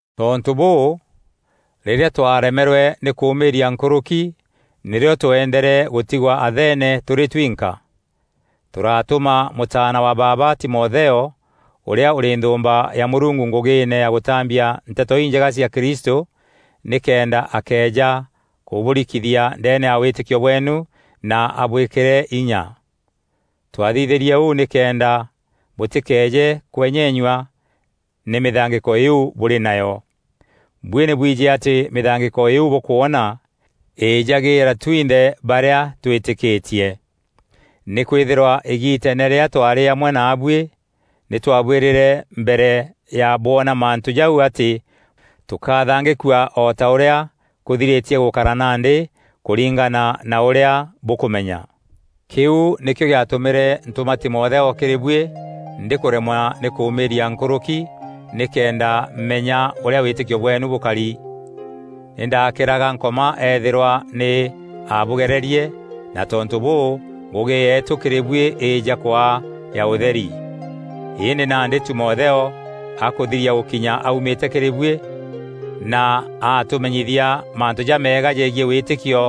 Tontû bûû, rîrîa twaremerwe nî kûmîîria nkûrûki, nîrîo twendere gûtigwa Athene tûrî twinka. Tûratûma mûtaana wa baaba Timotheo, ûrîa ûrî nthûûmba ya Mûrungu ngûgîîne ya gûtambia Nteto Injega cia Kristû nîkenda akeeja kûbûrikithia ndeene ya wîtîkio bweenu na abwîkîre inya. Twathithîrie ûu nîkenda bûtîkeeje kwenyenyua nî mîthangîko îîu bûrî nayo. Buî nî bwijî atî mîthangîko îîu bûkwona îjagîîra twinthe barîa twîtîkîtie. Nîkwîthîrwa îgiiteene rîrîa twarî amwe naabuî, nî twabwîrîre mbere ya bwona mantû jau atî tûkathangîkua o ta ûrîa kûthirîtie gûkara nandî kûringana na ûrîa bûkûmenya. Kîu nîkîo gîatûmîre ntûma Timotheo kîrî buî ndîkûremwa nî kûmîîria nkûrûki, nîkenda menya ûrîa wîtîkio bweenu bûkari. Nî ndakîraga Nkoma eethîrwa nî aabûgererie, na tontû bûû, ngûgî yeetû kîrî buî îîja kwaa ya ûtheri. Îndî nandî Timotheo akûthiria gûkinya aumîte kîrî buî, na atûmenyithia mantû jameega jegiî wîtîkio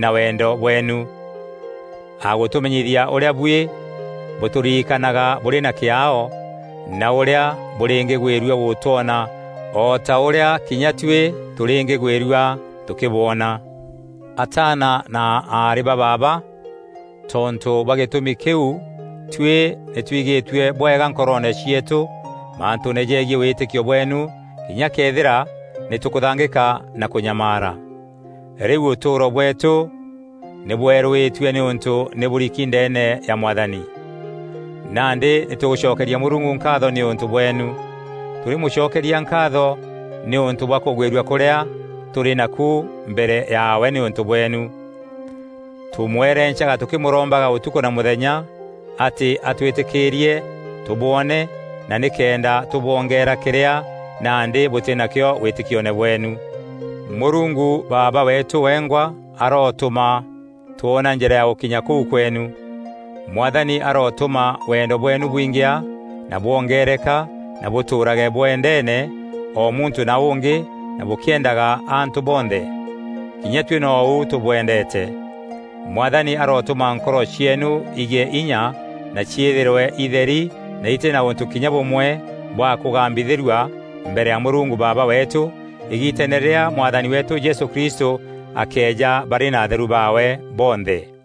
na wendo bweenu. Agûtûmenyithia ûrîa buî bûtûririkanaga bûrî na kîaao na ûrîa bûrîngîgwîrua gûtwona o ta ûrîa kinya tuî tûrîngîgwîrua tûkîbwona. Ataana na aarî ba baaba, tontû bwa gîtûmi kîu tuî nî twigîtue bwega nkoroone cieetû mantûûne jegiî wîtîkio bweenu kinya këethîra nî tûkûthangîka na kûnyamaara. Rîu ûtûûro bweetû nî bweerûîtue nîûntû nî bûriki ndeene ya Mwathani. Nandî nî tûgûcokeria Mûrungu nkaatho nîûntû bweenu. Tûrîmûcokeria nkaatho nîûntû bwa kûgwîrua kûrîa tûrî naku mbere yaawe nîûntû bweenu. Tûmwerencaga tûkîmûrombaga ûtukû na mûthenya atî atwîtîkîîrie tûbwoone na nîkenda tûbwongeera kîrîa nandî bûtî nakîo wîtîkione bweenu. Mûrungu Baaba weetû wengwa arotûma twona njîra ya gûkinya kûu kweenu. Mwathani arotûma wendo bweenu bwingîa na bwongereka na bûtûûrage bwendeene, o muntû na ûngî na bûkîendaga antû bonthe. Kinya tuî nou tûbwendeete. Mwathani arotûma nkoro cieenu igîe inya na ciîthîrwe itheri na itî na ûntû kinya bûmwe bwa kûgambithîrua mbere ya Mûrungu Baaba weetû îgiiteene rîrîa Mwathani weetû Jesû Kristû akeeja barî na atheru baawe bonthe.